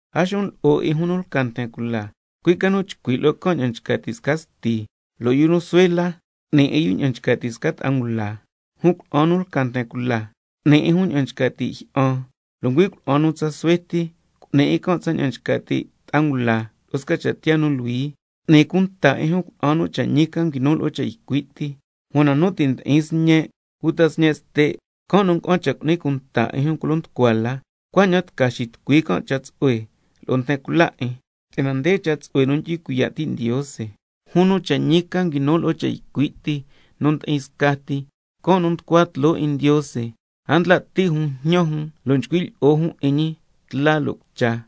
A xun lo'o 'in jun nu lca nten cula, cui' ca nu chcui' lo'o can' ña'an nchca ti' sca sti, lo' yu nu suhue la, cu'ni 'in yu ña'an nchca ti' sca ta'a ngula, jun cuna'an nu lca nten cula, cu'ni 'in jun ña'an nchca ti' jyi'an, lo' ngüi' cuna'an tsa suhue ti, cu'ni 'in can' tsaña'an nchca ti' ta'a ngula, lo'o sca cha' tiyaa nu luhui. Cu'ni cunta 'in jun cuna'an nu cha' ñi ca nguinu lo'o cha' ycui' ti. Una nu ti' ndi'in sñe' uta sñe' ste', can' nu nga'an cha' cu'ni cunta 'in jun culo nducua la, cuaña'an tca xitucui can' cha' tsu'hue lo'o nten cula 'in, si'yana nde cha' tsu'hue nu ndyu'hui cuiya' ti' Ndiose. Jun nu cha' ñi ca nguinu lo'o cha' ycui' ti nu ndi'in scati, can' nu nducua tloo 'in Ndiose, a ndla' ti' jun njñan jun lo' nchcui' lyi'o jun 'in ñi tla lo' cucha.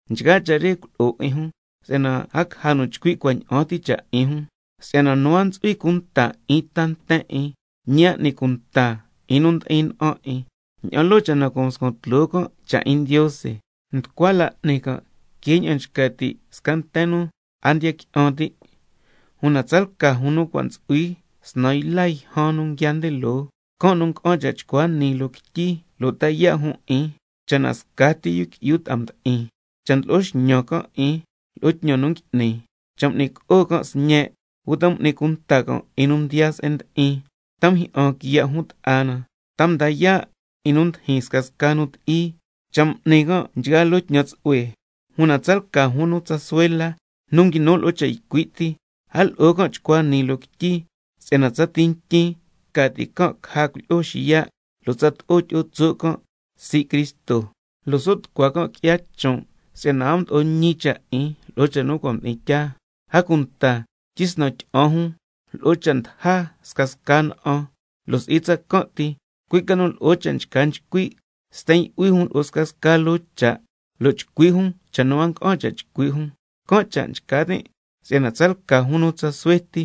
Nchgaa cha' re culo'o 'in jun, si'yana a caja nu chcui' cuaña'an ti cha' 'in jun. Si'yana nu a ntsu'hui cunta 'in ta nten 'in, ñi a n'ni cunta 'in nu ndi'in na'an 'in, ña'an loo cha' na cua' mscuan tloo can' cha' 'in Ndiose, nducua la n'ni can' que ña'an nchca ti' sca nten nu a ndiya qui'an ti'. Una tsalca jun nu cua' ntsu'hui snan yla yjan nu nguiaa nde loo, can' nu nga'an cha' chcua nii loo quityi lo' ta yaa' jun 'in, cha' na scati yu qui'yu ta'a mdi'in, cha' ndlo'o xñan can' 'in lo'o tñan nu ngui'ni, cha' m'ni co'o can' sñe', uta m'ni cunta can' 'in nu mdiyaa se'en ndi'in, ta mjyi'an can' quiya' jun ta'a na, ta mda yaa' 'in nu ndijin scasca nu ti'i, cha' m'ni can' nchgaa loo tñan tsu'hue. Una tsalca jun nu tsa suhue la, nu nguinu lo'o cha' ycui' ti, a lo'o can' chcua nii loo quityi, si'yana tsati ntyin ca ti' caja nten 'in xiya', lo' tsato'o tyi'o tso' can' sii' Cristo, cuaña'an so' tucua can' qui'ya chon', si'yana a mdo'o ñi cha' 'in lo'o cha' nu cua' mdi'in tyaa. A cunta tyisnan tyi'an jun lo'o cha' ndaja scasca na'an, lo' si'i tsacan' ti, cui' ca nu lo'o cha' nchca nchcui', sten yu'hui jun lo'o scasca loo cha', lo' chcui' jun cha' nu a nga'an cha' chcui' jun. Can' cha' nchca tin' si'yana tsalca jun nu tsa suhue ti,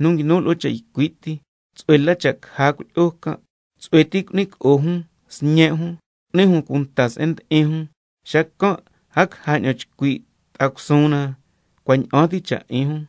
nu nguinu lo'o cha' ycui' ti, tsu'hue la cha' caja cuilyi'o can', tsu'hue ti cu'ni co'o jun sñe' jun, cu'ni jun cunta se'en ndi'in jun, xacan' a caja ña'an chcui' ta'a cusuun na cua' ña'an ti cha' 'in jun.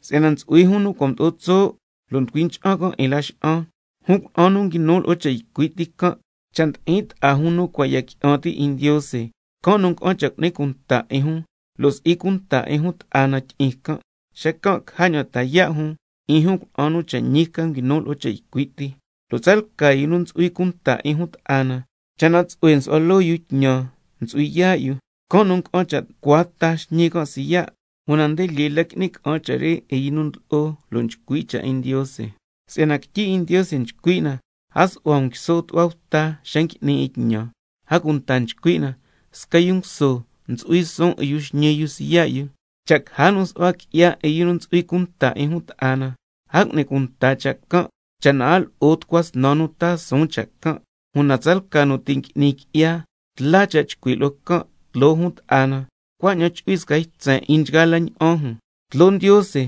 Si'yana ntsu'hui jun nu cua' mdo'o tso' lo' nducui cha'an can' 'in laxa'an. Jun cuna'an nu nguinu lo'o cha' ycui' ti can', cha' ndi'in ta'a jun nu cua' ya qui'an ti' 'in Ndiose, can' nu nga'an cha' chu'hui cunta 'in jun, lo' si'i cunta 'in jun ta'a na tyi'in can', xacan' caja ña'an ta yaa' jun 'in jun cuna'an nu cha' ñi ca nguinu lo'o cha' ycui' ti. Lo' tsalca yu nu ntsu'hui cunta 'in jun ta'a na, cha' na tsu'hue nsu'hua loo yu tñan ntsu'hui yaa' yu, can' nu nga'an cha' tucua ta xñi can' siya', una lyee la ngui'ni ca'an cha' re 'in yu nu ndlo'o lo' nchcui' cha' 'in Ndiose. Si'yana quityi 'in Ndiose nchcui' na: —A su'hua um quiso tu'hua bta xa ngui'ni 'in tñan—. A cunta nchcui' na: Sca yu nguso ntsu'hui suun 'in yu xñi yu siya' yu. Cha' caja nu su'hua qui'ya 'in yu nu ntsu'hui cunta 'in jun ta'a na, a cu'ni cunta cha' can', cha' na a lo'o —tucua snan nu taa suun cha' can'—. Una tsalca nu ti' ngui'ni qui'ya, tla cha' chcui' lo'o can' tloo jun ta'a na, cuaña'an chu'hui sca ytsen 'in jun scasca jun. Tloo Ndiose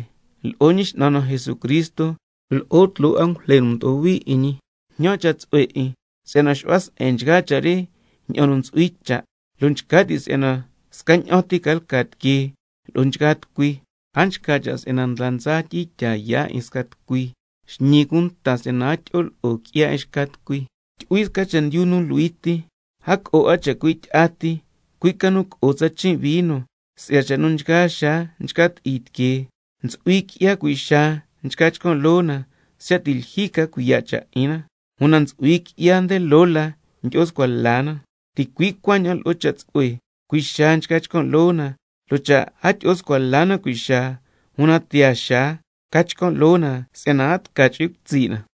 lo'o Ñi X'nan na Jesucristo, lo'o tloo angujle nu mdo'o hui 'in ñi, jñan cha' tsu'hue 'in si'yana xu'hua se'en nchgaa cha' re ña'an nu ntsu'hui cha', lo' nchca ti' si'yana scaña'an ti ca lca tiquee lo'o nchgaa tucui. A nchca cha' ndla ndsa tyi'in tyaa yaa' 'in sca tucui, xñi cunta si'yana a tyi'o lo'o qui'ya 'in xca tucui. Tyu'hui sca chendyu nu luhui ti. A co'o 'a chacui' tyi'a ti, cui' ca nu co'o tsa chin' vino si'ya cha' nu nchgaa xaa nchca ti'i tiquee. Ntsu'hui qui'ya cui' xaa nchca chcan' loo na siya' ti' lyijyi ca cuiya' cha' 'in na. Una ntsu'hui qui'ya nde loo la ndyi'o scua la na. Ticui' cuaña'an lo'o cha' tsu'hue, cui' xaa nchca chcan' loo na, lo' cha' a tyi'o scua la na cui' xaa, una tiyaa xaa ca chcan' loo na si'yana a tca chu'hui cutsi' na.